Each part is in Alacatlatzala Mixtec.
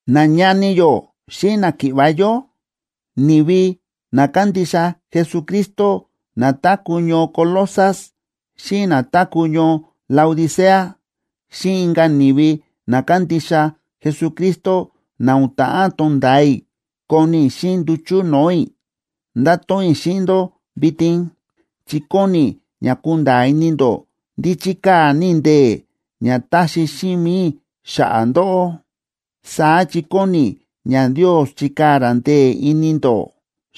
Nañani yó xíꞌin náki̱ꞌva̱ yó, ni̱vi na kándixa Jesucristo na táku̱ ñoo Colosas xíꞌin na táku̱ ñoo Laodicea, xíꞌin inka̱ ni̱vi na kándixa Jesucristo na o̱n ta̱ꞌán tonda̱a i̱ koni i̱ xíꞌin nduchu̱ no̱o̱ i̱, ndáto̱ꞌon i̱ xíꞌin ndó vitin, chi kóni i̱ ña kunda̱a̱ ini ndó ndí chíkaa̱ ní i̱ ndee̱ ña táxi xíꞌin mi̱i i̱ xa̱ꞌa̱ ndóꞌó. Saá chi kóni i̱ ña Ndios chikaa̱ ra ndee̱ ini ndó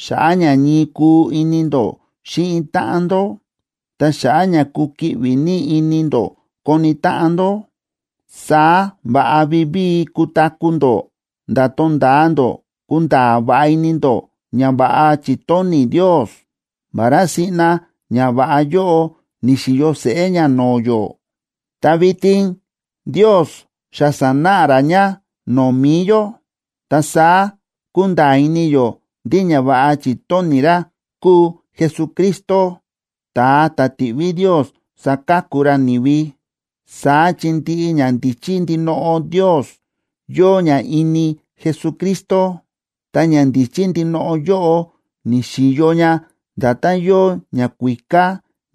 xa̱ꞌa̱ ña ñii kuu ini ndó xíꞌin táꞌan ndó, ta xa̱ꞌa̱ ña kukiꞌvi ní ini ndó koni táꞌan ndó. Saá va̱ꞌa vivíi kutaku̱ ndó nda̱ tonda̱a ndó kunda̱a̱ va̱ꞌa ini ndó ñava̱ꞌa chi̱tóni̱ Ndios. Vará siꞌna ñava̱ꞌa yóꞌo ni̱xi̱yo seꞌé ña no̱o̱ yó, ta vitin Ndios xa sa̱náꞌa ra ña no̱o̱ mi̱i yó, ta saá kúnda̱a̱ ini yó ndí ñava̱ꞌa chi̱tóni̱ ra kúu Jesucristo, ta̱a ta̱ ti̱ꞌví Ndios saka̱ku ra ni̱vi. Saá chi ndiꞌi ñandíchí ndinoꞌo Ndios yóo ña ini Jesucristo. Ta ñandíchí ndinoꞌo yóꞌo, ni̱xi̱yo ña nda̱tán yóo ñakuíká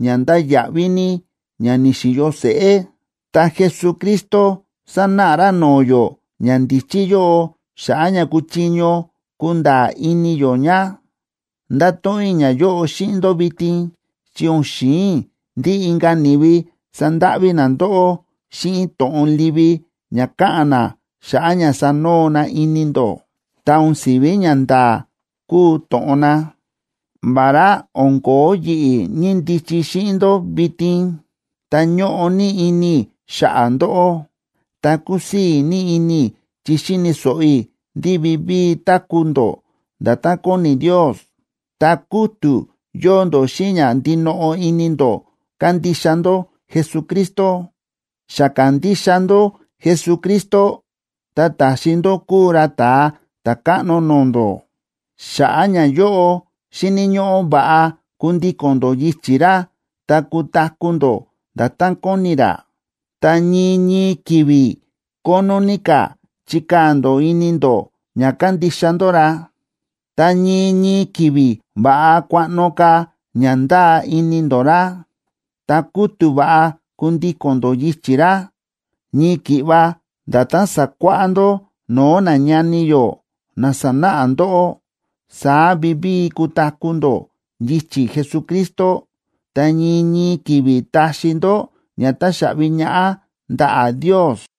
ña ndáya̱ꞌví ní ña ni̱xi̱yo seꞌé, ta Jesucristo sánáꞌa ra no̱o̱ yó ñandíchí yóꞌo xa̱ꞌa̱ ña kuchiño kunda̱a̱ ini yó ña. Ndáto̱ꞌon i̱ ñayóꞌo xíꞌin ndó vitin, chi o̱n xi̱in i̱ ndí inka̱ ni̱vi sandáꞌví na ndóꞌó xíꞌin to̱ꞌon livi ña káꞌa̱n na xa̱ꞌa̱ ña sanoo na ini ndó, ta o̱n si̱ví ñanda̱a̱ kúu to̱ꞌon na. Vará o̱n ko̱ó yi̱ꞌi̱ ñíndichi xíꞌin ndó vitin, ta ñóꞌo ní ini i̱ xa̱ꞌa̱ ndóꞌó, ta kúsii̱ ní ini i̱ chi xi̱ni̱ so̱ꞌo i̱ ndí vivíi táku̱ ndó nda̱tán kóni Ndios, ta kútu̱ yóo ndó xíꞌin ña ndinoꞌo ini ndó kándixa ndó Jesucristo. Xa ka̱ndixa ndó Jesucristo ta ta̱xi ndó kúu ra Ta̱a Ta̱káꞌno no̱o̱ ndó. Xa̱ꞌa̱ ñayóꞌo, xíni̱ ñóꞌó va̱ꞌa kundíko̱n ndó yichi̱ ra ta kutaku̱ ndó nda̱tán kóni ra. Ta ñii ñii ki̱vi̱ kónó ní ka̱ chikaa̱ ndó ini ndó ña kándixa ndó ra, ta ñii ñii ki̱vi̱ va̱ꞌa kuaꞌno ka̱ ña ndáa ini ndó ra, ta kútu̱ va̱ꞌa kundíko̱n ndó yichi̱ ra. Ñii ki̱ꞌva nda̱tán sa̱kuáꞌá ndó no̱o̱ nañani yó na sa̱náꞌa ndóꞌó, saá vivíi kutaku̱ ndó yichi̱ Jesucristo, ta ñii ñii ki̱vi̱ taxi ndó ña táxaꞌvi ñaꞌá ndaꞌa̱ Ndios.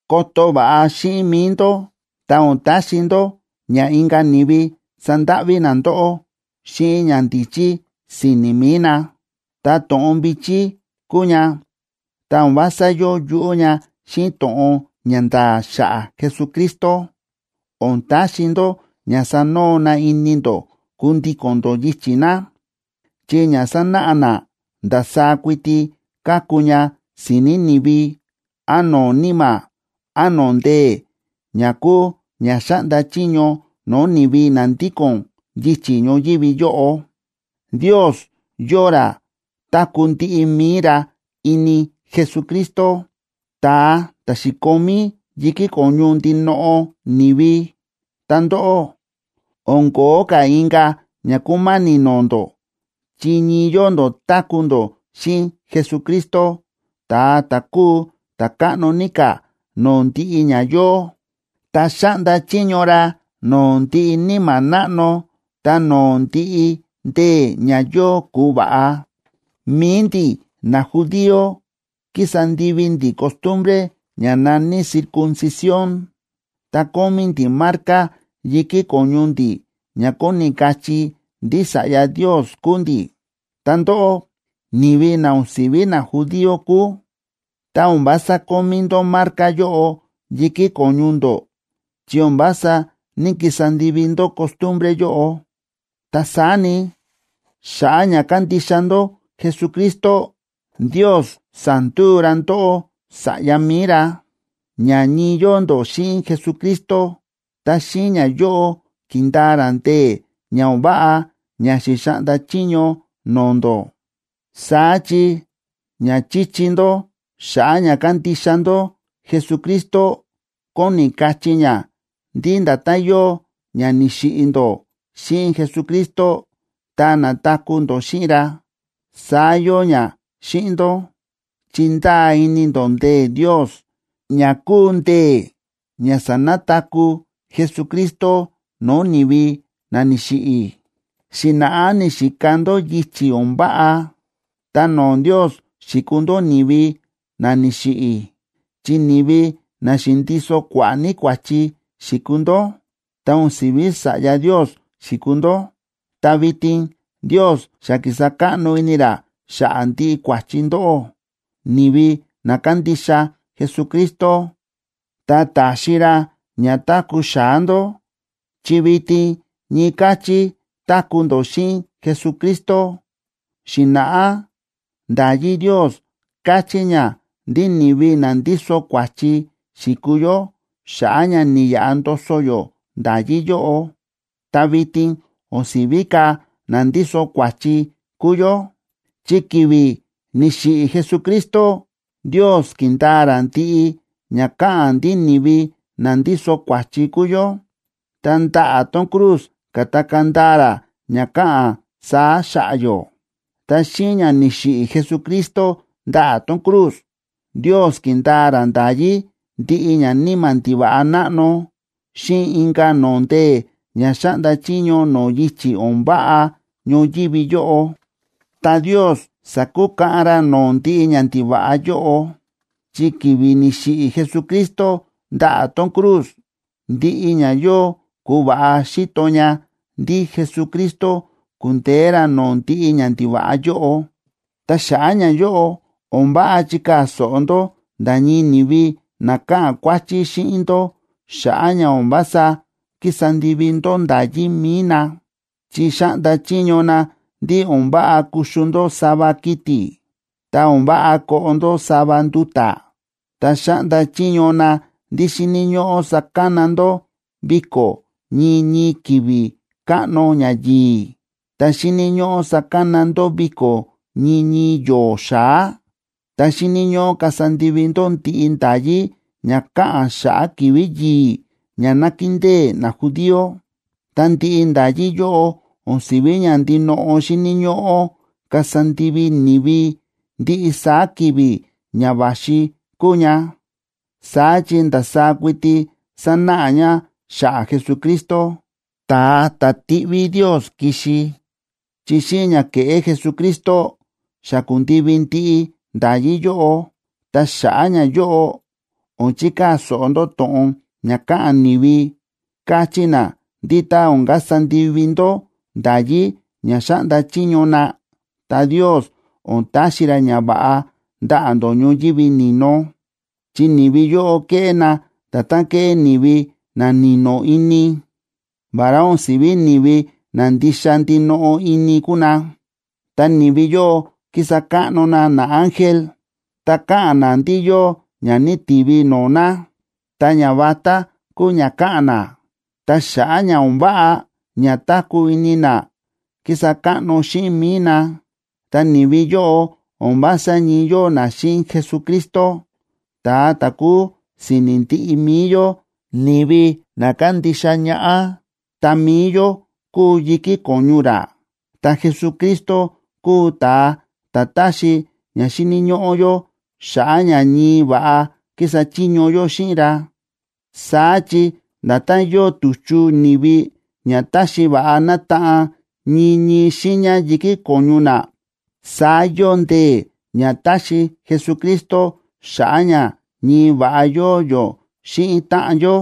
Koto va̱ꞌa xíꞌin mi̱i ndó ta o̱n taxi ndó ña inka̱ ni̱vi sandáꞌví na ndóꞌó xíꞌin ñandíchí si̱ni̱ mi̱i na, ta to̱ꞌon vi̱chí kúu ña, ta o̱n vása yóo yuꞌú ña xíꞌin to̱ꞌon ña nda̱a̱ xa̱ꞌa̱ Jesucristo. O̱n taxi ndó ña sanoo na ini ndó kundíko̱n ndó yichi̱ na, chi ña sánáꞌa na ndasaá kuiti káku ña si̱ni̱ ni̱vi án no̱o̱ níma̱ án no̱o̱ ndee̱ ña kúu ña xáꞌnda chiño no̱o̱ ni̱vi na ndíko̱n yichi̱ ñoyívi yóꞌo. Ndios yóo ra táku̱ ndiꞌi mi̱i ra ini Jesucristo, ta̱a ta̱ xi̱komí yi̱kí ko̱ñu ndinoꞌo ni̱vi. Ta ndóꞌó, o̱n ko̱ó ka̱ inka̱ ña kúma̱ni̱ no̱o̱ ndó chi ñii yóo ndó táku̱ ndó xíꞌin Jesucristo, ta̱a ta̱ kúu ta̱ káꞌno ní ka̱ no̱o̱ ndiꞌi ña yóo, ta xáꞌnda chiño ra no̱o̱ ndiꞌi níma̱ náꞌno ta no̱o̱ ndiꞌi ndee̱ ña yóo ku̱va̱ꞌa. Mi̱i ndi̱ najudío kísa ndivi ndi̱ costumbre ña na̱ní circuncisión,a ta kómí ndi̱ marca yi̱kí ko̱ñu ndi̱ ña kóni kachí ndí sa̱ꞌya Ndios kúu ndi̱. Ta ndóꞌó, ni̱vi na o̱n si̱ví najudío kúu, ta o̱n vása kómí ndó marca yóꞌo yi̱kí ko̱ñu ndó chi o̱n vása ní‑kisa ndivi ndó costumbre yóꞌo. Ta saá ni, xa̱ꞌa̱ ña kándixa ndó Jesucristo, Ndios sa̱nduu ra ndóꞌó sa̱ꞌya mi̱i ra, ña ñii yóo ndó xíꞌin Jesucristo, ta xíꞌin ñayóꞌo ki̱ndaa ra ndee̱ ña o̱n váꞌa ña xi̱xaꞌnda chiño no̱o̱ ndó. Saá chi ña chíchi ndó xa̱ꞌa̱ ña kándixa ndó Jesucristo kóni kachí ña ndí nda̱tán yóo ña ni̱xiꞌi̱ ndó xíꞌin Jesucristo ta na̱taku̱ ndó xíꞌin ra, saá yóo ña xíꞌin ndó, chi ndáa ini ndó ndee̱ Ndios, ña kúu ndee̱ ña sa̱nataku̱ Jesucristo no̱o̱ ni̱vi na ni̱xiꞌi̱. Xi̱na̱ꞌá ni̱xika ndó yichi̱ o̱n váꞌa, ta no̱o̱ Ndios xi̱kuu ndó ni̱vi na ni̱xiꞌi̱, chi ni̱vi na xi̱ndiso kua̱ꞌa̱ ní kua̱chi xi̱kuu ndó, ta o̱n si̱ví sa̱ꞌya Ndios xi̱kuu ndó. Ta vitin Ndios xa ki̱sa káꞌno ini ra xa̱ꞌa̱ ndiꞌi kua̱chi ndóꞌó, ni̱vi na kándixa Jesucristo, ta ta̱xi ra ña táku̱ xa̱á ndó, chi vitin ñii káchí táku̱ ndó xíꞌin Jesucristo. Xi̱na̱ꞌá nda̱yí Ndios káchí ña ndí ni̱vi na ndíso kua̱chi xi̱kuu yó xa̱ꞌa̱ ña ni̱yaꞌa ndoso yó nda̱yí yóꞌo. Ta vitin o̱n si̱ví ka̱ na ndíso kua̱chi kúu yó, chi ki̱vi̱ ni̱xiꞌi̱ Jesucristo, Ndios ki̱ndaa ra ndiꞌi ña káꞌa̱n ndí ni̱vi na ndíso kua̱chi kúu yó, ta ndaꞌa̱ tón cruz ka̱takaa̱ ndaa ra ña káꞌa̱n saá xa̱ꞌa̱ yó. Ta xíꞌin ña ni̱xiꞌi̱ Jesucristo ndaꞌa̱ tón cruz, Ndios ki̱ndaa ra nda̱yí ndiꞌi ñaníma̱ ndiva̱ꞌa náꞌno xíꞌin inka̱ no̱o̱ ndee̱ ña xáꞌnda chiño no̱o̱ yichi̱ o̱n váꞌa ñoyívi yóꞌo. Ta Ndios sa̱kukaꞌan ra no̱o̱ ndiꞌi ñandiva̱ꞌa yóꞌo, chi ki̱vi̱ ni̱xiꞌi̱ Jesucristo ndaꞌa̱ tón cruz, ndiꞌi ña yóo ku̱va̱ꞌa xi̱to ña ndí Jesucristo ku̱ndeé ra no̱o̱ ndiꞌi ñandiva̱ꞌa yóꞌo. Ta xa̱ꞌa̱ ñayóꞌo, o̱n váꞌa chikaa̱ so̱ꞌo ndó nda̱ ñii ni̱vi na káꞌa̱n kuáchí xíꞌin ndó xa̱ꞌa̱ ña o̱n vása kísa ndivi ndó nda̱yí mi̱i na. Chi xáꞌnda chiño na ndí o̱n váꞌa kuxu ndó sava kiti̱, ta o̱n váꞌa koꞌo ndó sava nduta̱. Ta xáꞌnda chiño na ndí xíni̱ ñóꞌó sakana ndó viko̱ ñii ñii ki̱vi̱ káꞌno ñayi̱i̱, ta xíni̱ ñóꞌó sakana ndó viko̱ ñii ñii yo̱o̱ xa̱á, ta xíni̱ ñóꞌó kasa ndivi ndó ndiꞌi nda̱yí ña káꞌa̱n xa̱ꞌa̱ ki̱vi̱ yi̱i̱ ña nákindée najudío. Ta ndiꞌi nda̱yí yóꞌo o̱n si̱ví ña ndinoꞌo xíni̱ ñóꞌó kasa ndivi ni̱vi ndiꞌi saá ki̱vi̱ ña va̱xi kúu ña. Saá chi ndasaá kuiti sánáꞌa ña xa̱ꞌa̱ Jesucristo, ta̱a ta̱ ti̱ꞌví Ndios ki̱xi, chi xíꞌin ña ke̱ꞌé Jesucristo, xa ku̱ndivi ndiꞌi nda̱yí yóꞌo. Ta xa̱ꞌa̱ ñayóꞌo, o̱n chikaa̱ so̱ꞌo ndó to̱ꞌon ña káꞌa̱n ni̱vi, káchí na ndí tá o̱n kasa ndivi ndó nda̱yí ña xáꞌnda chiño na, ta Ndios o̱n taxi ra ñava̱ꞌa ndaꞌa̱ ndó ñoyívi ni̱no. Chi ni̱vi yóꞌo kéꞌé na nda̱tán kéꞌé ni̱vi na ni̱no̱ ini, vará o̱n si̱ví ni̱vi na ndixa ndinoꞌo ini kúu na. Ta ni̱vi yóꞌo kísa káꞌno na naángel, ta káꞌa̱n na ndí yóo ña ni̱ti̱vi no̱o̱ na, ta ñavatá kúu ña káꞌa̱n na. Ta xa̱ꞌa̱ ña o̱n váꞌa ña táku̱ ini na kísa káꞌno xíꞌin mi̱i na. Ta ni̱vi yóꞌo o̱n vása ñii yóo na xíꞌin Jesucristo, ta̱a ta̱ kúu si̱ni̱ ndiꞌi mi̱i yó, ni̱vi na kándixa ñaꞌá, ta mi̱i yó kúu yi̱kí ko̱ñu ra. Ta Jesucristo kúu ta̱a ta̱ táxi ña xíni̱ ñóꞌó yó xa̱ꞌa̱ ña ñii va̱ꞌa kísa chiño yó xíꞌin ra. Saá chi nda̱tán yóo tu̱chu ni̱vi ña táxi va̱ꞌa nátaꞌan ñii ñii xiiña yi̱kí ko̱ñu na, saá yóo ndee̱ ña táxi Jesucristo xa̱ꞌa̱ ña ñii va̱ꞌa yóo yó xíꞌin táꞌan yó.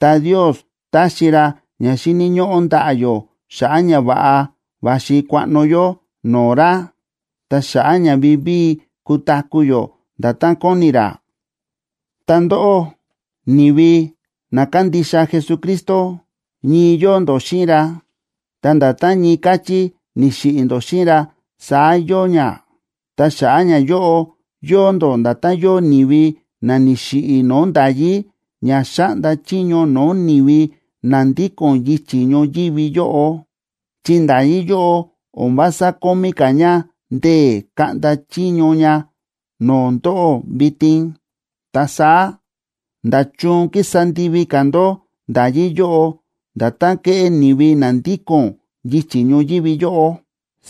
Ta Ndios táxi ra ña xíni̱ ñóꞌó ndaꞌa̱ yó xa̱ꞌa̱ ña va̱ꞌa va̱xi kuaꞌno yó no̱o̱ ra, ta̱ xa̱ꞌa̱ ña vivíi kutaku̱ yó nda̱tán kóni ra. Ta ndóꞌó, ni̱vi na kándixa Jesucristo, ñii yóo ndó xíꞌin ra, ta nda̱tán ñii káchí ni̱xiꞌi̱ ndó xíꞌin ra, saá yóo ña. Ta xa̱ꞌa̱ ñayóꞌo, yóo ndó nda̱tán yóo ni̱vi na ni̱xiꞌi̱ no̱o̱ nda̱yí ña xáꞌnda chiño no̱o̱ ni̱vi na ndíko̱n yichi̱ ñoyívi yóꞌo, chi nda̱yí yóꞌo o̱n vása kómí ka̱ ña ndee̱ kaꞌnda chiño ña no̱o̱ ndóꞌó vitin. Ta saá, ¿nda̱chun kísa ndivi ka̱ ndó nda̱yí yóꞌo, nda̱tán kéꞌé ni̱vi na ndíko̱n yichi̱ ñoyívi yóꞌo?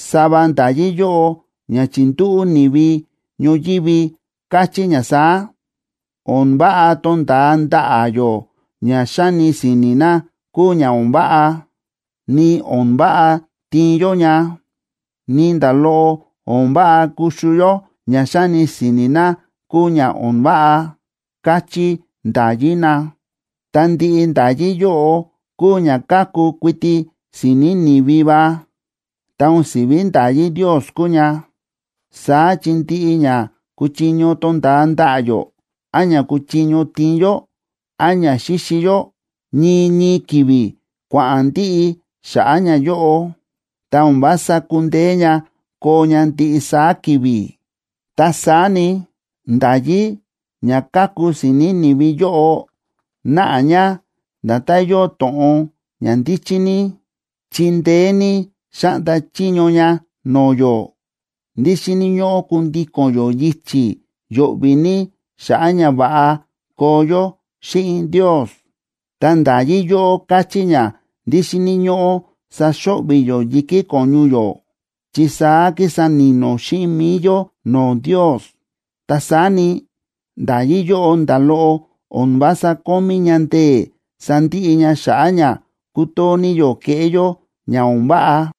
Sava nda̱yí yóꞌo ña chi̱ndúꞌu̱ ni̱vi ñoyívi káchí ña saá: “O̱n váꞌa tonda̱a ndaꞌa̱ yó ña xáni si̱ni̱ na kúu ña o̱n váꞌa, ni o̱n váꞌa tiin yó ña, ni nda̱ loꞌo o̱n váꞌa kuxu yó ña xáni si̱ni̱ na kúu ña o̱n váꞌa”, káchí nda̱yí na. Ta ndiꞌi nda̱yí yóꞌo kúu ña káku kuiti si̱ni̱ ni̱vi va, ta o̱n si̱ví nda̱yí Ndios kúu ña. Saá chi ndiꞌi ña kúchiño tonda̱a ndaꞌa̱ yó, án ña kúchiño tiin yó, án ña xíxi yó, ñii ñii ki̱vi̱ kua̱ꞌa̱n ndiꞌi xa̱ꞌa̱ ñayóꞌo, ta o̱n vása kúndeé ña koo ña ndiꞌi saá ki̱vi̱. Ta saá ni, nda̱yí ña káku si̱ni̱ ni̱vi yóꞌo náꞌa ña nda̱tán yóo to̱ꞌon ña ndíchí ní, chi ndeé ní xáꞌnda chiño ña no̱o̱ yó ndí xíni̱ ñóꞌó kundíko̱n yó yichi̱ yo̱ꞌvi̱ ní xa̱ꞌa̱ ña va̱ꞌa koo yó xíꞌin Ndios. Ta nda̱yí yóꞌo káchí ña ndí xíni̱ ñóꞌó saxo̱ꞌvi̱ yó yi̱kí ko̱ñu yó chi saá kísa ni̱no̱ xíꞌin mi̱i yó no̱o̱ Ndios. Ta saá ni, nda̱yí yóꞌo nda̱ loꞌo o̱n vása kómí ña ndee̱ sandiꞌi ña xa̱ꞌa̱ ña kútoo ní yó kéꞌé yó ña o̱n váꞌa.